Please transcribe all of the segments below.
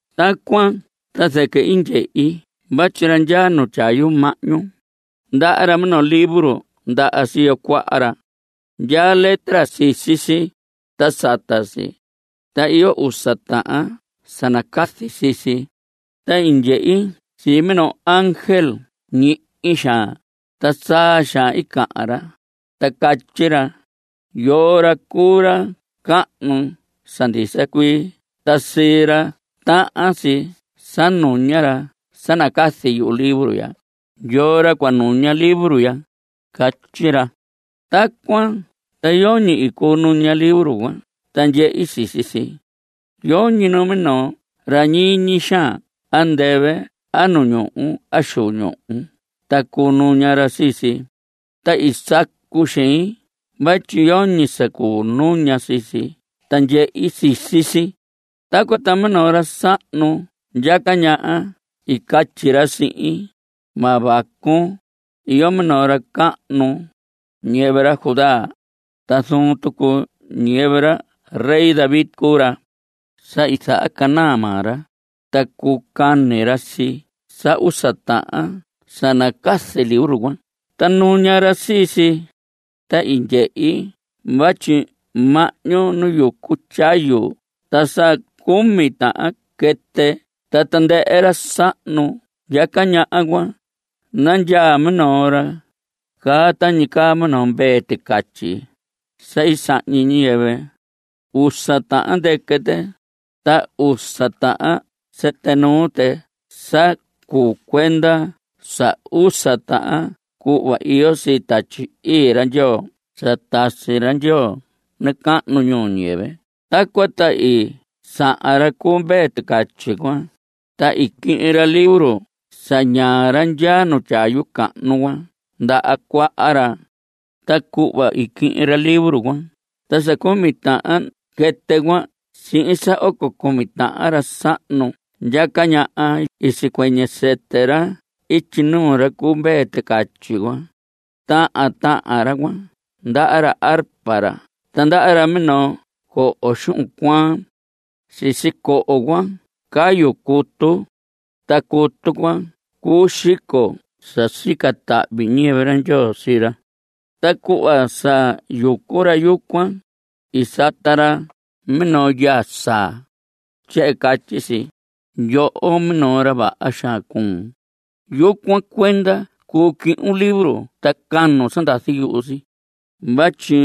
Tacuan ta zɨquɨ i ndyehi vatyi ra ndyaa tyayu mahñu, ndaha ra minoo libro ndaha siyo cuaha ra. Ndyaa letra sisi si, ta sata si. Ta iyo usa tahan sa nacazi sii si. Ta i ndyehi sii minoo ángel ñihi xaan, ta saa xaan cahan ra, ta catyi ra: ¿Yoo ra cuu ra cahnu sa ndisa cuii ta sii ra tahan si sa nuña ra sa nacazi libro ya? ¿Yoo ra cua nuña libro ya? Catyi ra. Tacuan ta yoñi i cuu nuña libro cuan ta ndyehe sisi si. Yoñi minoo ra ñiñi xaan andɨvɨ a nu ñuhu a xu ñuhu ta cuu nuña ra sii si. Ta i sacu xein vatyi yoñi sa cuu nuña sii si ta ndyehe sisi si. Tacuan ta minoo ra sahnu ndyaca ñaha i catyi ra sihin: Ma vacun. Iyo minoo ra cahnu, ñiyɨvɨ ra Judá. Ta zuun tucu ñiyɨvɨ ra David cuu ra. Sa i zahacanaa maa ra, ta cuu cani ra sii sa usa tahan sa nacazi libro cuan ta nuña ra sii si. Ta i ndyehi vatyi mahñu nu yucu tyayu ta sa cumi tahan quɨtɨ ta tandɨhɨ ra sahnu ndyaca ñaha cuan nandyaa minoo ra caa tañi caa minoo mvee ticatyi sa i sahñi ñiyɨvɨ. Usa tahan ndɨquɨ tɨ, ta usa tahan sɨtɨ nuu tɨ sa cuu cuenda sa usa tahan cuhva iyo sii Tatyi Ii ra Ndyoo sa tasi ra Ndyoo nacahnu ñuu ñiyɨvɨ. Tacuan ta i sahan ra cu mvee ticatyi cuan, ta i quihin ra libro sa ñaa ra ndyaa tyayu cahnu cuan ndaha cuaha ra. Ta cuhva i quihin ra libro cuan ta sa cumi tahan quɨtɨ cuan sihin sa oco cumi tahan ra sahnu ndyaca ñaha cuan i sicuɨñɨ sɨtɨ ra ityi nuu ra cu mvee ticatyi cuan. Tahan tahan ra cuan ndaha ra arpa ra ta ndaha ra minoo coho xuhun cuaan. Sisi coho cuan cayu cutu. Ta cutu cuan cuu xico sa sica tahvi ñiyɨvɨ ra Ndyoo sii ra. Ta cuhva sa yucu ra yucuan, i sata ra minoo yaa saa. Tyehen catyi si: Yoho, minoo ra vaha xaan cuun. Yucuan cuenda cuu cuhun libro ta canun sa ndazi yuhu si. Vatyi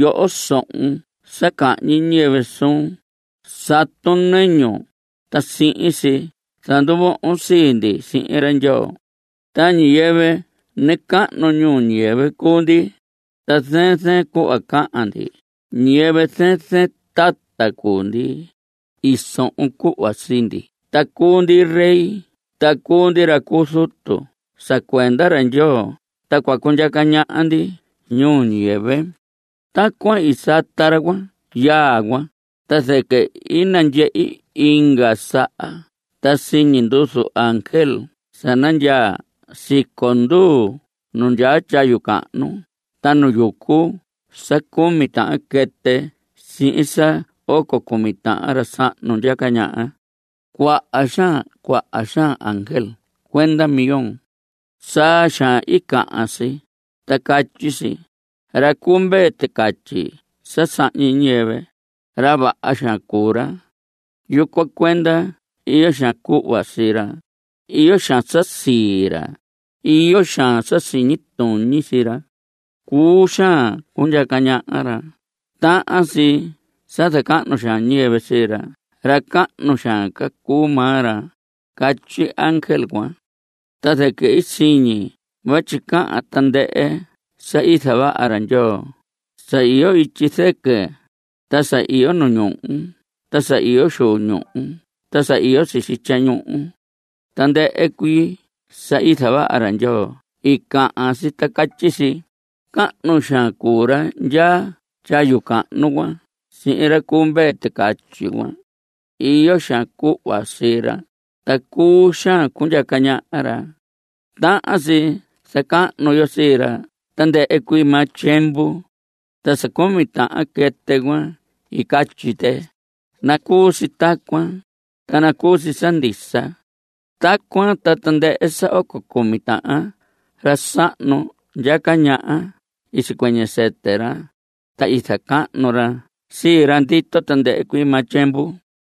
yoho, sohon sa cahñi ñiyɨvɨ suun. Satun nɨñun, ta sihin si zanduvohon sii ndi sihin ra Ndyoo. Ta ñiyɨvɨ nacahnu ñuu ñiyɨvɨ cuu ndi, ta zɨɨn zɨɨn cuhva cahan ndi. Ñiyɨvɨ zɨɨn zɨɨn tata cuu ndi. I sohon cuhva sii ndi ta cuu ndi rey ta cuu ndi ra cu zutu sa cuenda ra Ndyoo, ta cua cundyaca ñaha ndi ñuu ñiyɨvɨ. Tacuan i sata ra cuan yaa cuan, ta zɨquɨ i nandyehi inga saha ta siñi nduzu ángel sa nandyaa siconduu nu ndyaa tyayu cahnu ta nu yucu sa cumi tahan quɨtɨ sihin sa oco cumi tahan ra sahnu ndyaca ñaha. Cuaha xaan cuaha xaan ángel cuenda millón. Saa xaan i cahan si, ta catyi si: Ra cu mvee ticatyi sa sahñi ñiyɨvɨ, ra vaha xaan cuu ra. Yucuan cuenda iyo xaan cuhva sii ra. Iyo xaan sa sii ra. Iyo xaan sa siñi tuñi sii ra. Cuu xaan cundyaca ñaha ra. Tahan si sa zacahnu xaan ñiyɨvɨ sii ra. Ra cahnu xaan ca cuu maa ra. Catyi ángel cuan. Ta zɨquɨ siñi vatyi cahan tandɨhɨ sa i zavaha ra Ndyoo, sa iyo ityi zɨquɨ, ta sa iyo nu ñuhu ta sa iyo xu ñuhu ta sa iyo sisi tyañuhu. Tandɨhɨ cuii sa i zavaha ra Ndyoo i cahan si ta catyi si: Cahnu xaan cuu ra ndyaa tyayu cahnu cuan sihin ra cu mvee ticatyi cuan. Iyo xaan cuhva sii ra, ta cuu xaan cundyaca ñaha ra. Tahan si zacahnu yo sii ra tandɨhɨ cuii maa tyiemvu. Ta sa cumi tahan quɨtɨ cuan i catyi tɨ: ¡Nacuu si tacuan, ta nacuu si sa ndisa! Tacuan ta tandɨhɨ sa oco cumi tahan ra sahnu ndyaca ñaha i sicuɨñɨ sɨtɨ ra, ta i zacahnu ra sii ra ndito tandɨhɨ cuii maa tyiemvu.